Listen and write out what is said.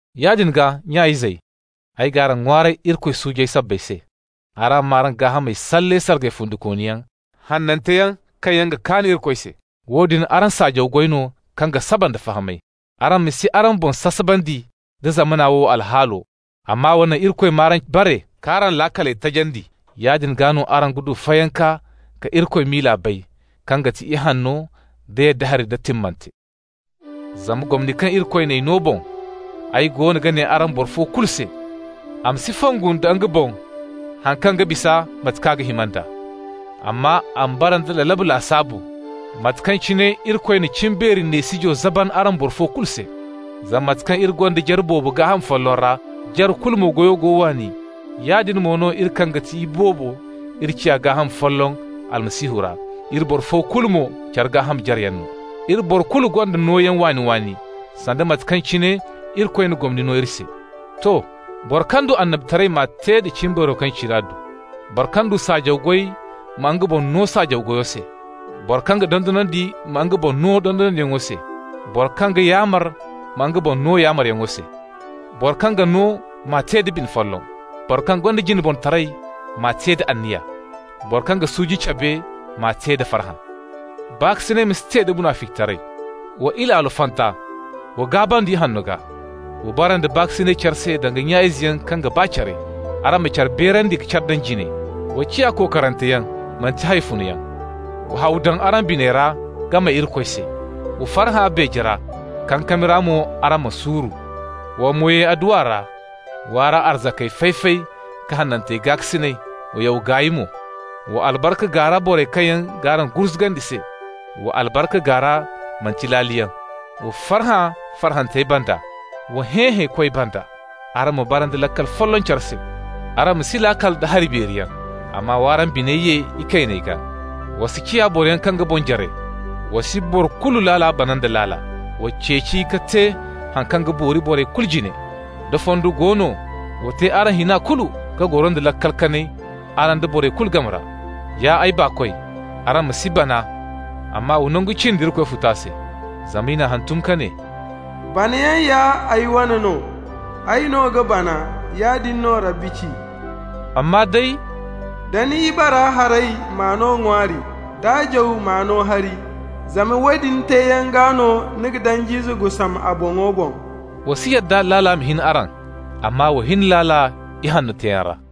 Yaadin gaa, nya-izey, ay g'araŋ ŋwaaray Irikoy suujey sabbay se: araŋ m'araŋ gaahamey salle sargay fundikooniyaŋ, hananteyaŋ, kaŋ yaŋ ga kaan Irikoy se. Woodin araŋ saajaw goy no kaŋ ga saba nda fahamay. Araŋ ma si araŋ boŋ sasabandi nda zamana wo alhaalo, amma wa naŋ Irikoy m'araŋ bare, k'araŋ laakaley tajandi. Yaadin gaa no araŋ ga du fayanka ka Irikoy miila bay, kaŋ ga ti ihanno, da yadda hari, da timmante. Zama, gomni kaŋ Irikoy n'ay no boŋ, ay goono ga ne araŋ boro fo kulu se: a ma si fongu nda nga boŋ haŋ kaŋ ga bisa mate kaŋ ga hima nd'a, amma a ma bara nda lalabu lasaabu, mate kaŋ cine Irikoy na cimbeeri neesijo zaban araŋ boro fo kulu se. Zama mate kaŋ iri gonda jare boobo gaaham folloŋ ra, jare kulu mo goyo go waani, yaadin mo no iri, kaŋ ga ti iboobo, iri ciya gaaham folloŋ Almasihu ra, iri boro fo kulu mo care gaaham jareyaŋ no. Iri boro kulu gonda nooyaŋ waani-waani, sanda mate kaŋ cine Irikoy na gomni no iri se. To. Boro kaŋ du annabitaray m'a te da cimbeero kaŋ cine a du. Boro kaŋ du saajaw goy ma nga boŋ no saajaw goyo se. Boro kaŋ ga dondonandi ma nga boŋ no dondonandiyaŋo se. Boro kaŋ ga yaamar ma nga boŋ no yaamaryaŋo se. Boro kaŋ ga no m'a te da bine folloŋ. Boro kaŋ gonda jineborotaray m'a te da anniya. Boro kaŋ ga suuji cabe m'a te da farhã. Baakasinay ma si te da munaficitaray. Wa ilaalo fanta, wa gaabandi ihanno gaa. Wa bara nda baakasinay care se danga nya izeyaŋ kaŋ ga ba care. Araŋ ma care beerandi ka care daŋ jine. Wa ciya kokoranteyaŋ, manti hawfunoyaŋ. Wa haw daŋ araŋ biney ra ka may Irikoy se. Wa farhã beeje ra, kankami ra mo araŋ ma suuru. Wa mo ye adduwa ra. W'araŋ arzaka fay-fay ka hanantey gaakasinay, wa yaw gaay mo. Wa albarka gaara borey kaŋ yaŋ g'araŋ gurzugandi se. Wa albarka gaara, manti laaliyaŋ. Wa farhã farhantey banda, wa hẽ hẽekoy banda. Araŋ ma bara nda laakal folloŋ care se. Araŋ ma si laakal da hari beeriyaŋ, amma w'araŋ biney ye ikayney gaa. Wa si ciya boroyaŋ kaŋ ga boŋ jare. Wa si boro kulu laala bana nda laala. Wa ceeci ka te haŋ kaŋ ga boori borey kulu jine. Da fondo go no, wa te araŋ hina kulu ka goro nda laakal kanay, araŋ da boro kulu game ra. Ya ay baakoy, araŋ ma si bana, amma wa nangu cindi Irikoy futa se. Zama i n'a hantum ka ne: «Banayaŋ ya ay wane no. Ay no ga bana.» Yaadin no Rabbi ci. Amma day: «Da ni ibara haray, m'a no ŋwaari. D'a jaw, m'a no hari. Zama woodin teeyaŋ gaa no ni ga danj'ize gusam a boŋo boŋ.» Wa si yadda laala ma hin araŋ, amma wa hin laala ihanno teeyaŋ ra.